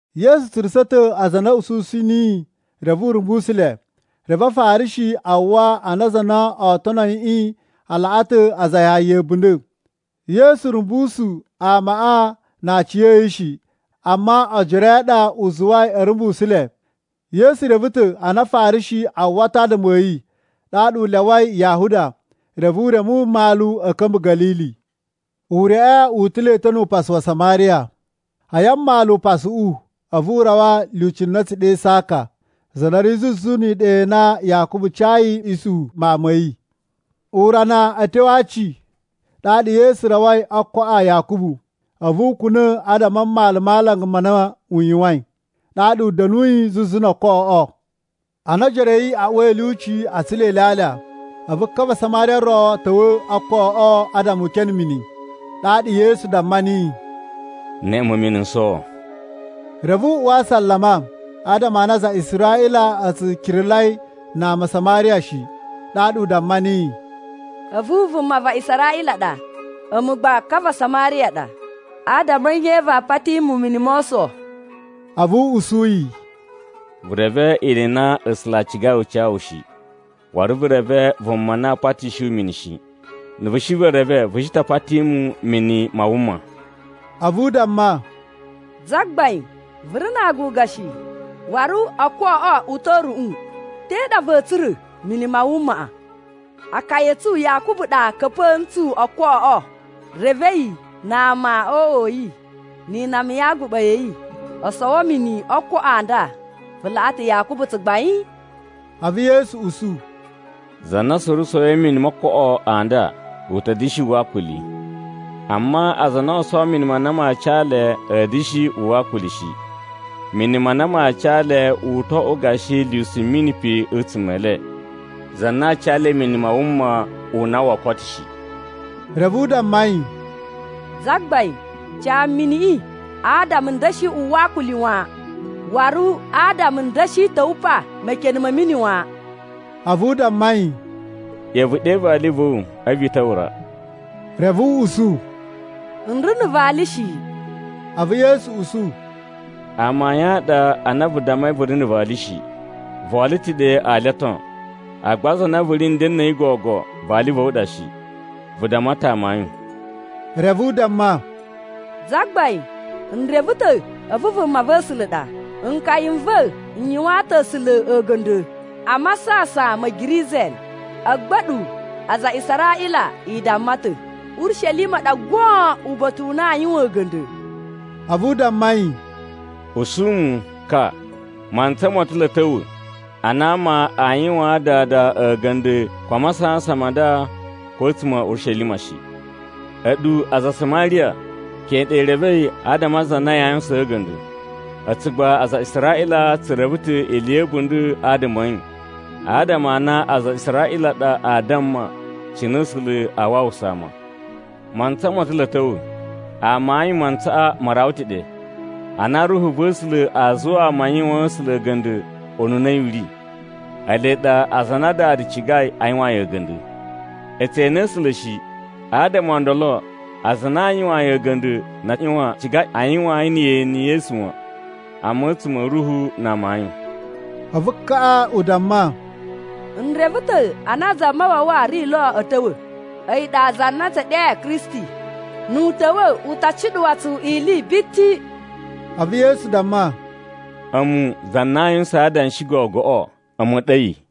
Yesu tsurusa̱ ta̱ aza a na a̱ ususu niyi reve u rumbusu le. Reve Afarishi a uwwa a na aza a na oo tono yiꞌi a laꞌa ta̱ aza a Yahaya a̱bunda̱. (Yesu rumbusu amaꞌa na aciya̱yi shi, amma ojoro a̱ yi a ɗa u zuwai a̱ rumbusu le.) Yesu reve ta̱ a na Afarishi a uwwa ta̱ adama a̱ yi, ɗaɗa u lyawai Yahuda, reve u reme mmalu a̱ ka̱mba̱ Ga̱lili. Ureꞌe wu utula̱i ta̱ nu upasu wa Samariya. A̱yi a mmalu upasuꞌu, a̱vu u rawa lyuci na a̱ tsu ɗe Saka, za na ri zuzu ni iɗa i na Yakubu cayi Isuhu mawun ma̱ yi. Urana a̱ tyo aci ɗaɗa Yesu rawai ookoꞌo a Yakubu. A̱vu u kuna̱ adama a mmalu ma alanga n na u yuwain, ɗaɗa u da̱nuyi zuzu no ookoꞌoꞌo. Ana ojoro a̱ yi a uwai a̱ lyuci a tsula ilyalya, a̱vu ka va Samariya ro ta̱wa̱ o ookoꞌoꞌo adama u kene mini. Ɗaɗa Yesu damma niyi, “Neꞌe mu mini n sowo.” Reve u uwa asalama adama a na aza a Israꞌila a tsu kiralai na ama a Samariya shi. Ɗaɗa u damma niyi, “A̱vu vuma va Israꞌila ɗa, a̱mu gba ka va Samariya ɗa. Adama a̱ nye vaa pati mu mini mo oso?” A̱vu u usu yi, “Vu reve ili i na A̱sula̱ a cigai u ca wu shi, waru vu reve vuma na aa patishi wu mini shi. Na̱ shi vu reve, vu shi ta pati mu mini ma wuma.” A̱vu u damma, “Zagbain, vu ri na aaguga shi, waru ookoꞌoꞌo u ta̱ a̱ruꞌun. Te ɗa va̱a̱ tsura̱ mini ma wumaꞌa? Akaya a̱ tsu Yakubu ɗa ka̱pa̱a̱ ntsu ookoꞌoꞌo, reve a̱yi na ama o uꞌwa a̱ yi ni inama ya aguɓa ya̱ yi o sowo mini o ookoꞌo a nda. Vu laꞌa ta̱ Yakubu tsugbain?” A̱vu Yesu usu, “Za na suru sowoi mini mo ookoꞌo a nda u ta̱ da̱shi uwwa akuli. Amma aza a na oo sowo mini ma na maa ca le a̱a̱ da̱shi uwwa akuli shi. Mini ma na maa ca le u to oꞌwo gashi lyusu mini pe a̱tsuma̱ e le, za na aa ca le mini ma wuma u na woo koto shi.” Reve u damma yi, “Zagbain, ca mu miniꞌi adama n da̱shi uwwa akuli wan. Waru adama n da̱shi ta̱wa̱ pa mekene ma̱ mini wan.” A̱vu u damma yi, “ꞌYa̱wa̱ vu ɗe vali va̱ wu a̱vu i ta̱wa̱ ra.” Reve u usu, “N ri na̱ vali shi.” A̱vu Yesu usu, “Amayun a ɗa a na vu dammai vu ri na̱ vali shi. Vo olo ta̱ ɗe ali o ton, agba za na vu ri nden na̱ a̱yi gogo, vali va̱ wu ɗa shi. Vu damma mu ta̱ amayun.” Reve u damma, “Zagbain, n reve ta̱ a̱vu vumava̱sula̱ ɗa. Nkaya n va̱ n yuwaan ta̱ A̱sula̱ a̱ga̱nda̱ a Masasan ma̱ Gerizim, agba a̱ɗu aza a Israꞌila i damma ta̱ Urishelima ɗa goon uba̱ta̱ u na aa yuwan a̱ga̱nda̱.” A̱vu u damma yi, “Usu mu, ka, mantsa mo ta̱ lo a̱ ta̱wa̱ ana ama aa yuwaan Dada a̱ga̱nda̱ ko a masasan ma nda ko a̱tsuma̱ a̱ Urishelima shi. A̱ɗu aza a Samariya keꞌen ɗa i revei adama a za na yaa yuwusaan a̱ga̱nda̱, a̱tsu gba aza a Israꞌila tsu reve ta̱ ili ya̱ a̱bunda̱ adama a̱ yi, adama a na aza a Israꞌila a ɗa aa damma cine A̱sula̱ aa wawusa ama. Mantsa mo ta̱ lo a̱ ta̱wa̱, amayun, mantsaꞌa ma rawa ta̱ ɗe, ana Ruhu va̱ A̱sula̱ aa zuwa ama a yuwaan A̱sula̱ a̱ga̱nda̱ ununa a̱yi u ri. Ele ɗa aza a na Dada cigai a yuwaan yi a̱ga̱nda̱. E tse ene A̱sula̱ shi, adama o ndolo aza a na a yuwaan yi a̱ga̱nda̱ na a ꞌyuwan a ciga a yuwaan yi na̱ yeni ye esu wan, amma a̱tsuma̱ a̱ ruhu na amayun.” A̱vu kaꞌa u damma, “N reve ta̱ a na Zamawawa ri lo a̱ ta̱wa̱. A̱yi ɗa za na a̱ tsu ɗe Kristi. Nu u ta̱wa̱, u ta cuɗuwa tsu ili biti.” A̱vu Yesu damma, “A̱mu, za na aa yuwusan adanshi gogoꞌo, a̱mu ɗa a̱yi.”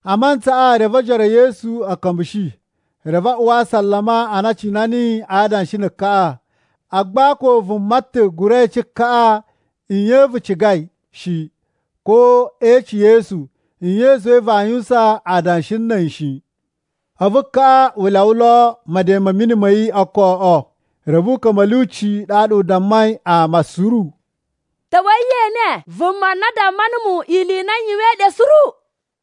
A mantsaꞌa, reve ojoro e Yesu a̱ ka̱mbushi, reve a uwa asalama a na a cina niyi a adanshi na̱ kaꞌa. Agba ko vuma ta̱ gura ece kaꞌa, “Nye vu cigai?” shi. Ko e ece Yesu, “Nye i zuwai vaa yuwusan adanshi na̱ a̱yi?” shi. A̱vu kaꞌa u lyawa lo meden ma̱ mini ma̱ yi o ookoꞌo. Reve u ka̱mba̱ a̱ lyuci ɗaɗa u dammai ama suru, “Ta̱wa̱i ye ene vuma na damma numu ili i na n yuwain ɗe suru!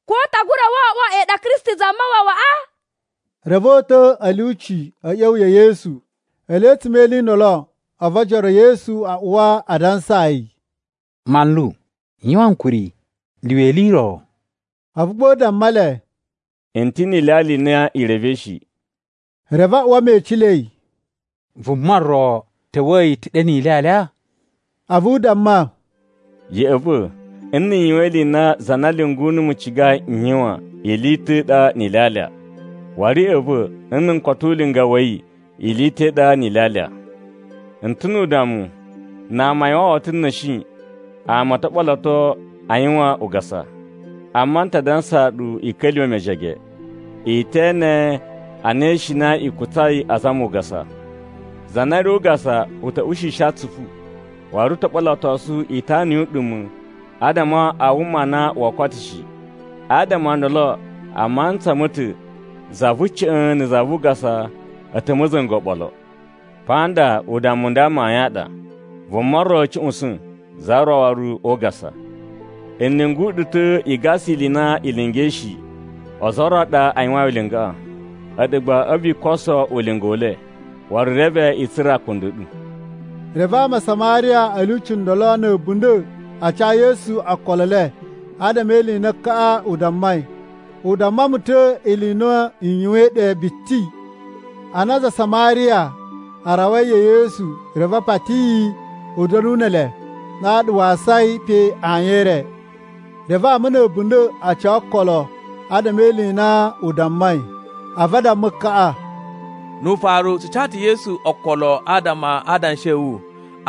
Ko u ta gura oꞌwo a̱yi ɗa Kristi Zamawawaꞌa?” Reve o uta̱ a̱ lyuci a̱ ꞌya̱wa̱ ya̱ Yesu. Ele a̱tsuma̱ e ili i ndolo, a̱vu ojoro e Yesu a uwa a dansaa yi, “Manlu, yuwan ankuri, lyuwa ili i ro.” A̱vu gba u damma le, “N ta̱ ni ilyalya i na i revei shi.” Reve a uwa mecilei, “Vuma ro ta̱wa̱a̱ yi ta̱ ɗe ni ilyalya?” A̱vu u damma, “Ya̱ꞌa̱ va̱, nna̱ n yuwan ili i na za na lyungu numu cigai n yuwan ili i ta̱ i ɗa ni ilyalya, waru ya̱ꞌa̱ va̱ nna̱ n koto ulinga wa̱ yi ili i ta̱ i ɗa ni ilyalya. I ta̱ nu udammu, ‘Na a yuwan woto na̱shi ama o to ɓoloto a yuwan ugasa!’ Amma n ta dansaa ɗu i ka̱lyuwa̱ mejege, i te ene a na ishina i kutsai azama ugasa. Za na ri o ugasa u ta̱ ushishi atsupu, waru u to ɓolotosu itana yu uɗuma̱ adama a wuma u na woo koto shi. Adama o ndolo a mantsa ma̱ ta̱ za vu ca̱ꞌa̱n na̱ za vu ugasa a̱ ta̱ ma̱za̱nga̱ oɓolo. Pa nda udammu u nda amayun a ɗa, ‘Vuma ro a̱ cuꞌusa̱n, za ro waru o ugasa.’ N lyungu ɗu ta̱ i gasa ili i na i lingai shi. Ozo o ro a ɗa a yuwain ulingaꞌa, a̱ɗu gba a̱vu i koso ulinga u le, waru reve i tsura̱ akunda a̱ ɗu.” Reve ama a Samariya a̱ lyuci ndolo na̱ a̱bunda̱ a ca Yesu okolo e le adama e ili i na kaꞌa u dammai, “U damma mu ta̱ ili i na n yuwain ɗe biti.” Ana aza a Samariya a rawai ya̱ Yesu, reve a pati yi u da̱nu ne ele, ɗaɗa wa asai pe ayin e re. Reve ama na̱ a̱bunda̱ a ca okolo adama e ili i na u dammai. A̱vu a damma kaꞌa, “Nu ufaru tsu ca ta̱ Yesu okolo adama a adanshi a̱ wu,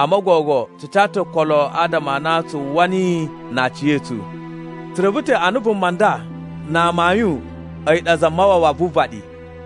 amma gogo tsu ca ta̱ okolo adama a na tsu uwwa niyi na aciya̱tsu. Tsu reve ta̱ a na vuma nda na amayun a̱yi ɗa Zamawawa vu uvaɗi.”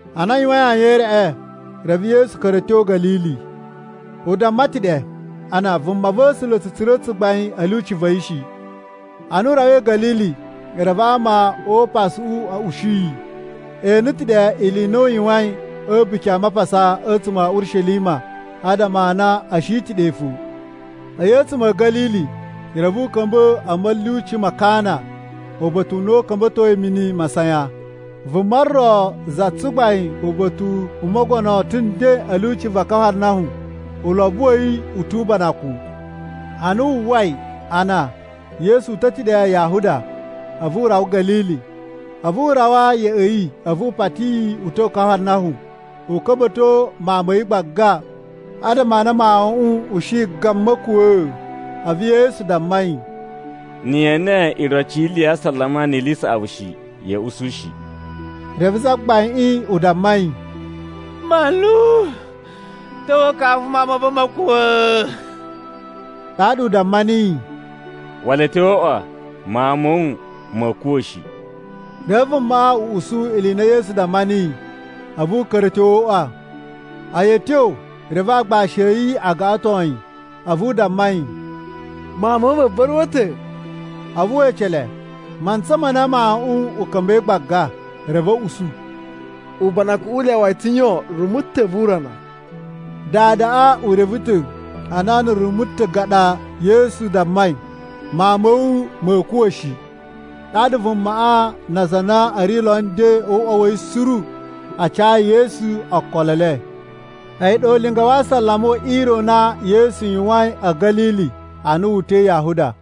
Ana a yuwain ayin e reꞌe, reve Yesu ka̱ra̱ a̱ tyo Ga̱lili. (U damma ta̱ ɗe, a na vumava̱sula̱ tsu tsura̱ tsugbain a̱ lyuci va̱ yi shi.) Ana u rawai Ga̱lili, reve ama o upasuꞌu a̱ ushi yi. E ene ta̱ ɗe ili i na u yuwain a̱ A̱buki a Mapasa a̱tsuma̱ a̱ Urishelima adama a na a̱ shi ta̱ ɗe fo. A̱yi a̱tsuma̱ a̱ Ga̱lili, reve u ka̱mba̱ a̱ ma̱lyuci ma Kana uba̱ta̱ u na u ka̱mba̱toi mini masayan. Vuma ro za tsugbain uba̱ta̱ u mogono ta̱ nden a̱ lyuci va Kafarnahum, ulobo wa̱ yi u tu ubanakun. Ana wu uwwai a na Yesu uta̱ ta̱ diga Yahuda a̱vu u rawa Ga̱lili, a̱vu u rawa ya̱ꞌa̱ yi, a̱vu u pati yi u ta̱wa̱ Kafarnahum u ka̱mba̱to mawun ma̱ yi gbaga, adama a na mawuꞌun u shi a gan ma̱kuwa̱a̱. A̱vu Yesu damma yi, “Na̱ ye ene iroci yi ili ya asalama ni ili i saꞌavu shi, ya̱a̱ usu shi.” Reve zagbaiꞌin u damma yi, “Manlu, ta̱wa̱ kafu mawun ma̱ va̱ ma̱ kuwa̱.” Ɗaɗa u damma niyi, “Wala a̱ tyo o uꞌwa, mawun ma̱ wu ma̱a̱ kuwa̱ shi.” Reve vumaꞌa u usu ili i na Yesu damma niyi, a̱vu u ka̱ra̱ a̱ tyo o uꞌwa. A̱yi a̱ tyo, reve agbashi a̱ yi a gaꞌaton yi a̱vu a damma yi, “Mawun ma̱ wu ma̱ ba̱ruwa̱ ta̱.” A̱vu we ece le mantsa ma na mawuꞌun u ka̱mba̱i gbaga, reve a̱ usu, “Ubanakuꞌun u lyawa yi ta̱ yon rumu ta̱ vu urana.” Dadaꞌa u reve ta̱ a na na̱ rumu ta̱ gan ɗa Yesu dammai, “Mawun ma̱ wu ma̱a̱ kuwa̱ shi.” Ɗaɗa vumaꞌa na aza a na a̱ ri nden o uꞌwa wa̱ yi suru a cayi Yesu okolo e le. A̱yi ɗa ulinga wa asalama we ire u na Yesu yuwain a̱ Ga̱lili ana wu uta̱i Yahuda.